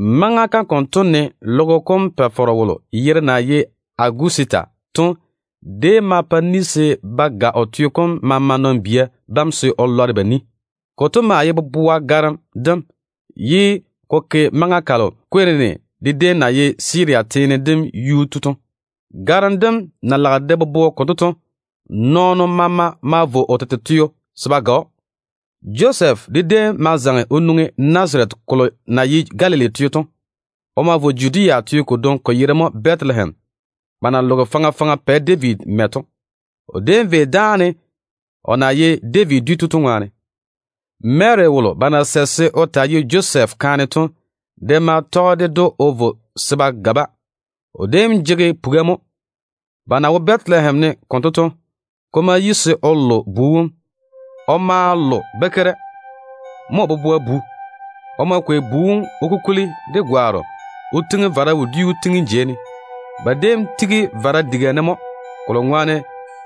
Maŋa kam konto ne logo kom Pa-faro wolo yere na ye Agusita to déem ma pa ni se ba ga o teo kom maama nɔn-bia bam se o lɔre ba ni. Konto maa ye boboa garem dem, ye ko ke maŋa kalo Kwirinusi de déem na ye Siria teo kom yuu tu to. Garem dem na lage de bobo konto to, nɔɔno maama ma vo o tete teo se ba ga‑o. Josɛf de déem ma zaŋe o nwoŋi Nazarete kolo na ye Galili teo to. O ma vo Judea teo kodwoŋi, ko yere mo Bɛtelehem, ba na loge faŋa faŋa Pɛ David mɛ to. O déem vei dáane, o na ye David dwi tu to ŋwaane. Mary wolo ba na sɛ se o taa ye Josɛf kaane to de ma tɔge ded‑o o vo se ba ga-ba. O déem jege puga mo. Ba na wo Bɛtelehem ne konto to, ko ma yi se o lo bu wom. O ma lo bakeira. Mo o boboa bu. O ma kwei bu wom o kukuli de gwaaro o tiŋi vara wodiu tiŋim jeiga ne, pwola na wo daare veira diga kam wone to ŋwaane.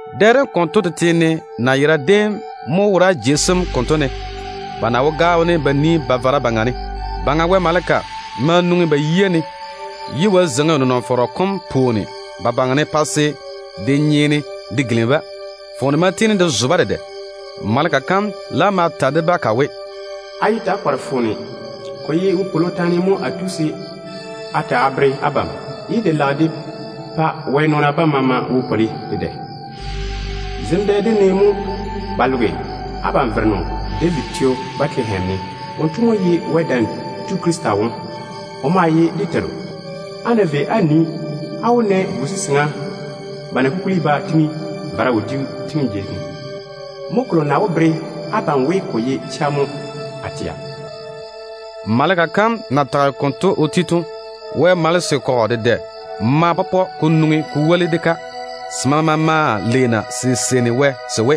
Dɛ dem konto tete ne nayera déem mo wora jei sem konto ne, ba na wo gaao ne ba yere ba vara. Baŋa Wɛ maleka ma nwoŋi ba yia ne, ye Wɛ zeiŋi o nenɔŋ-fɔrɔ kom pwooni ba baŋa ne pa se de nyeene de gilimi-ba. Foone ma tiini de zo-ba dedɛ. Maleka kam laam ma ta de-ba ka we, “Yé ta‑á kɔre-na foone. Ko ye kwor-ywoŋa mo a tu se a ta a bere abam, ye ka lage ka pa Wɛ nɔɔna bam maama di ywoni dedɛ. Zem dɛ dem ne mo ba loge abam Vereno David teo Bɛtelehem ne. Wonto mo ye Wɛ Dam Tu Krista wom. O maa ye dé Teiru. Á ná vei á nii, á wó na bu-seseŋa ba na kukuli ba tiŋi vara wodiu tiŋim jei ne. Mo kolo na wó bere abam we, ko ye chega mo a tɛa.” Maleka kam na tage konto o ti to, Wɛ telaao malese kɔgɔ dedɛ ma pɔpɔ se nwoŋi se woli de-ka. Se maama maa leena se seini Wɛ se we: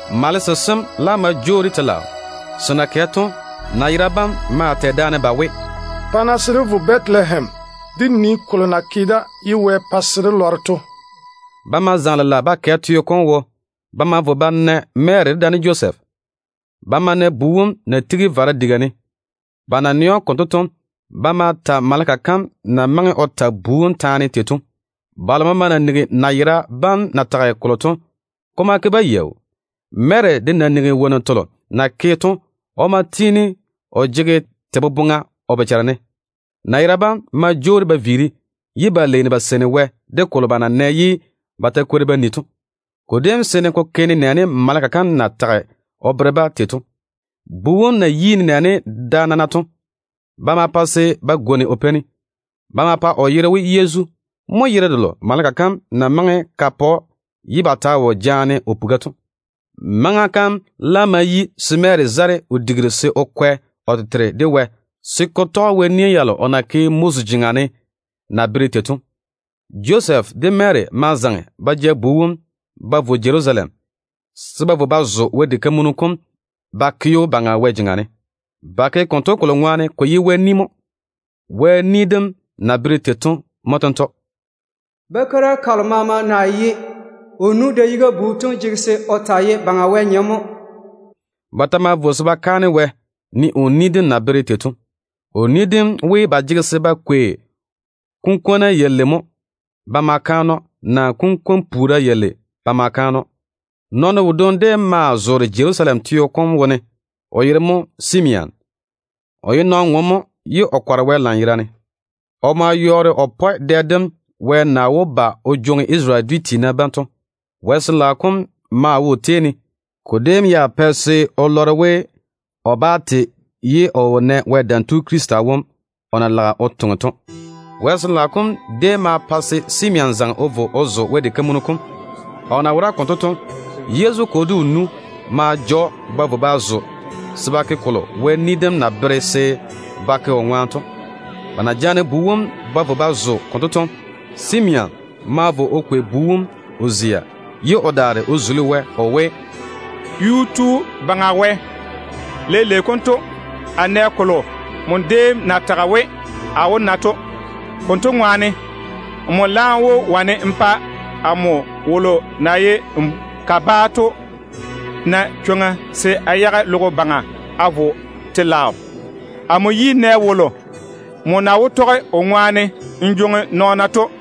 Malese sem laam ma jwoori telaao. Se na kɛ to, nayera bam maa tɛ daane ba we, “Pa-na se dé vo Bɛtelehem de nii kolo na ke da ye Wɛ pa se de lɔre to.” Ba ma zaŋe lela ba kɛ teo kom wo. Ba ma vo ba na Mary dedaane Josɛf. Ba ma na bu wom na tigi vara wodiu tiŋim jeiga ne. Ba na nɛ‑o konto to, ba ma ta maleka kam na maŋe o ta bu wom taane tei to. Balo maama na nigi nayera bam na tage kolo to, ko ma ke-ba yaau. Mary de na nigi wonnu telo na ke to, o maa tiini o jege te boboŋa o bochare ne. Nayera bam ma jwoori ba viiri, ye ba leeni ba seini Wɛ de kolo ba na nɛ ye ba ta kwori ba ni to. Ko déem seene ko ke nenɛɛne maleka kam ya na wuuri o ta o bere-ba tei to. Bu wom na yi nenɛɛne da nana to, ba ma pa se ba gwoni o peini. Ba ma pa o yere we Yezu. Mo yere delo maleka kam na maŋe ka pa‑o ye ba ta wo jaane o puga to. Maŋa kam laam ma yi se Mary zare o digiru se o kwɛ o tete de Wɛ, se ko tɔge Wɛ nia yalo o na ke Moses jeŋa ne na bere tei to. Josɛf de Mary ma zaŋe ba ja bu wom ba vo Jerusalem, se ba vo ba zo Wɛ diga kam ba ke‑o Baŋa Wɛ jeŋa ne. Ba ke konto kolo ŋwaane ko ye Wɛ ni mo. Wɛ ni dem na bere tei to mo tento: “Bakeira kalo maama na ye o nu da-yiga bu to jege se o taa ye Baŋa Wɛ nyem mo.” Ba ta ma vo se ba kaane Wɛ, ne o ni dem na bere tei to. O ni dem we, ba jege se ba kwei kunkwona balei naa kunkwon-puura balei ba ma kaane‑o. Nɔɔno wodwoŋi déem maa zoore Jerusalem teo kom wone, o yere mo Simeon. O ye nɔn-ŋom mo, ye o kɔre Wɛ lanyerane. O maa yɔɔre o pɔe dɛ dem Wɛ na wó ba o jwoŋi Isarele dwi tiina bam o yage to. Wɛ Sin-laao kom maa wo o tei ne. Ko déem ya pɛ se o lɔre we, o wó na Wɛ Dam Tu Krista wom mo, ye o laam te. Wɛ Sin-laao kom déem ma pa se Simeon zaŋe o vo o zo Wɛ diga kam. O na wora konto to, Yezu kwo de o nu ma ja‑o ba vo ba zo se ba ke kolo Wɛ ni dem na bere se ba ke o ŋwaane to. Ba na jaane bu wom ba vo ba zo konto to, Simeon ma vo o kwei bu wom o zia, ye o daare o tei Wɛ o we: “Yuu-tu Baŋa Wɛ, leile konto a nɛ wolo nmo déem na tage we a wó na to. Konto ŋwaane, nmo laam wó wane n pa amo wolo na ye nmo kabaa to na chwoŋa se a yage logo baŋa a vo telaao. Amo yi nɛ wolo nmo na wó tɔge o ŋwaane n jwoŋi n nɔɔna n yage to.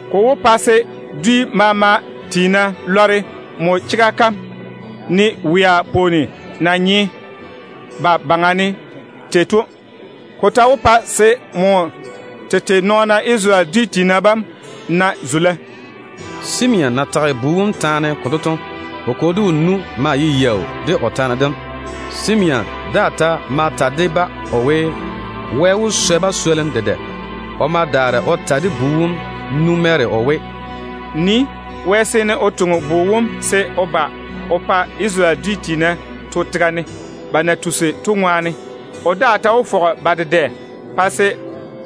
Ko wó pa se dwi maama tiina lɔre nmo chega kam jaja, ne wea pwooni na nye ba baŋa ne tei to. Ko ta wó pa se nmo tete nɔɔna Isarele dwi tiina bam na zula.” Simeon na tage bu wom taane konto to, o kwo de o nu maa ye yaau de o taane dem. O daa ta ma ta de-ba o we, Wɛ wó swɛ ba swolim dedɛ. O ma daare o ta de bu wom nu Mary o we, “Nii mo. Wɛ seene o toŋe bu wom se o ba o pa Isarele tiina dedɛ to tega ne. O daa ta wó fɔge ba dedɛ pa se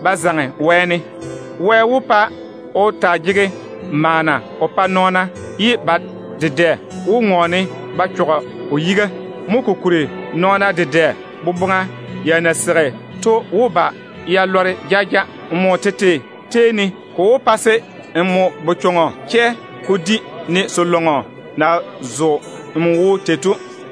ba zaŋe wɛɛne. Wɛ wó pa o taa jege maana o pa nɔɔna, ye ba dedɛ nam wó ŋɔɔne ba chɔge o yiga. Mo kokuri nɔɔna dedɛ boboŋa ya na seigi to wó ba ya lɔre jaja. Nmo tete tei ne, ko wó pa se n bochɔŋɔ chɛ ko di, ne se-zɔɔ na zo n wo tei to.”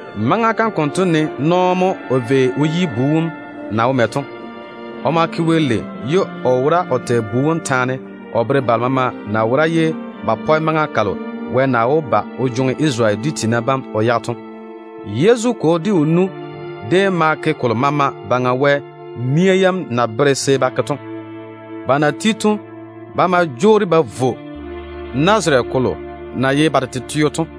Maŋa kam konto ne nɔɔ mo o vei o yi bu wom na wo mɛ to. O ma ke Wɛ lei, ye o wora o tɛ bu wom taane o bere balo maama na wora ye ba pɔe maŋa kalo Wɛ na wó ba o jwoŋi Isarele dwi tiina bam o yage to. Yezu kwo de o nu déem ma ke kolo maama Baŋa Wɛ nia yam na bere se ba ke to. Ba na ti to, ba ma jwoori ba vo Galili teo Nazarete mɛ na ye ba tete teo to.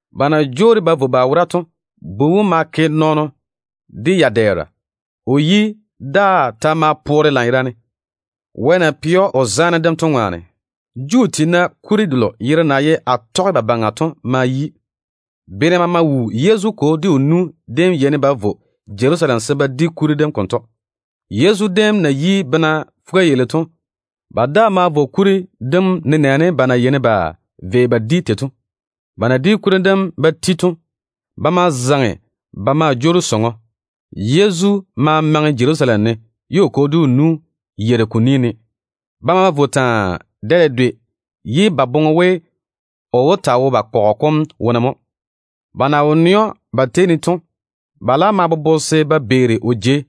Ba na jwoori ba vo ba wora to, bu wom ma ke nɔɔno de ya-dɛɛra. O yi daa ta ma poore lanyerane, Wɛ na ke zaane o ke o yuu ne to ŋwaane. Juu tiina kuri delo yere na ye Atɔgebabaŋa to ma yi. Bene maama wuu Yezu kwo de o nu déem yeini ba vo Jerusalem se ba di kuri dem konto. Yezu déem na yi bena fuga-yalei to, ba daa ma vo kuri dem nenɛɛne ba na yeini ba vei ba di tei to. Ba na di kuri dem ba ti to, ba ma zaŋe ba maa jwoori sɔŋɔ. Yezu ma maŋe Jerusalem ne, ye o kwo de o nu yeiri ko ni ne. Ba ma vo taa, dɛ dedwe, ye ba boŋe we o wó taa wo ba kɔgɔ kom wone mo. Ba na wo nɛ‑o ba tei ne to, ba laam ma bobo se ba beeri o jei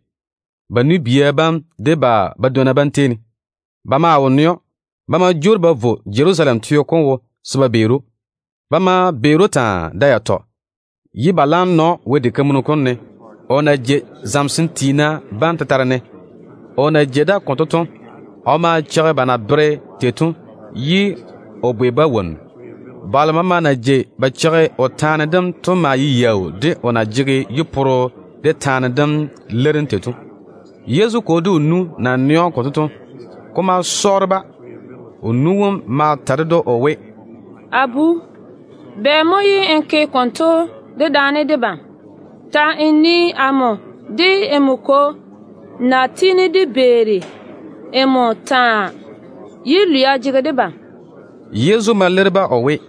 ba chorro tem de ba badwonna bam tei ne. Ba maa wo nɛ‑o. Ba ma jwoori ba vo Jerusalem teo wo se ba beeri‑o. Ba ma beeri‑o taa, da yatɔ, ye ba laam na‑o Wɛ diga kam ne, o na jei zamesem tiina bam tetare ne. O na jei da konto to, o maa cheigi ba na bere tei to, ye o bwei-ba wonnu. Balo maama na jei ba cheigi o taane dem to maa ye yaau de o na jege yi-poro de taane dem leirim tei to. Yezu kwo de o nu na nɛ‑o konto to, ko ma pa ba yera sɔɔre. O nu wom ma ta ded‑o o we, “A bu, bɛ mo ye n ke konto dedaane debam? Ta‑n nii amo de nmo kwo na tiini de beeri nmo taa, ye lwia jege debam.” Yezu ma leiri-ba o we,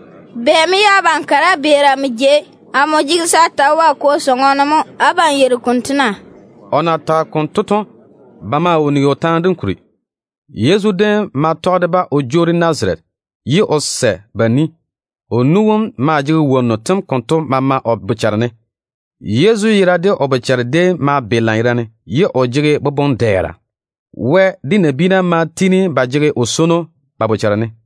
“Bɛ mo ye abam kare á beeri amo jei? Amo jege se a ta wo a Kwo sɔŋɔ ne mo. Abam yeiri konto na?” O na tage konto to, ba maa wo nigi o taane dem kuri. Yezu déem ma tɔge de-ba o jwoori Nazarete, ye o sɛ ba ni. O nu wom maa jege wonnu tem konto maama o bochare ne. Yezu yera de o bochare déem ma be lanyerane, ye o jege boboŋ-dɛɛra. Wɛ de nabiina maa tiini ba lage o ni taane.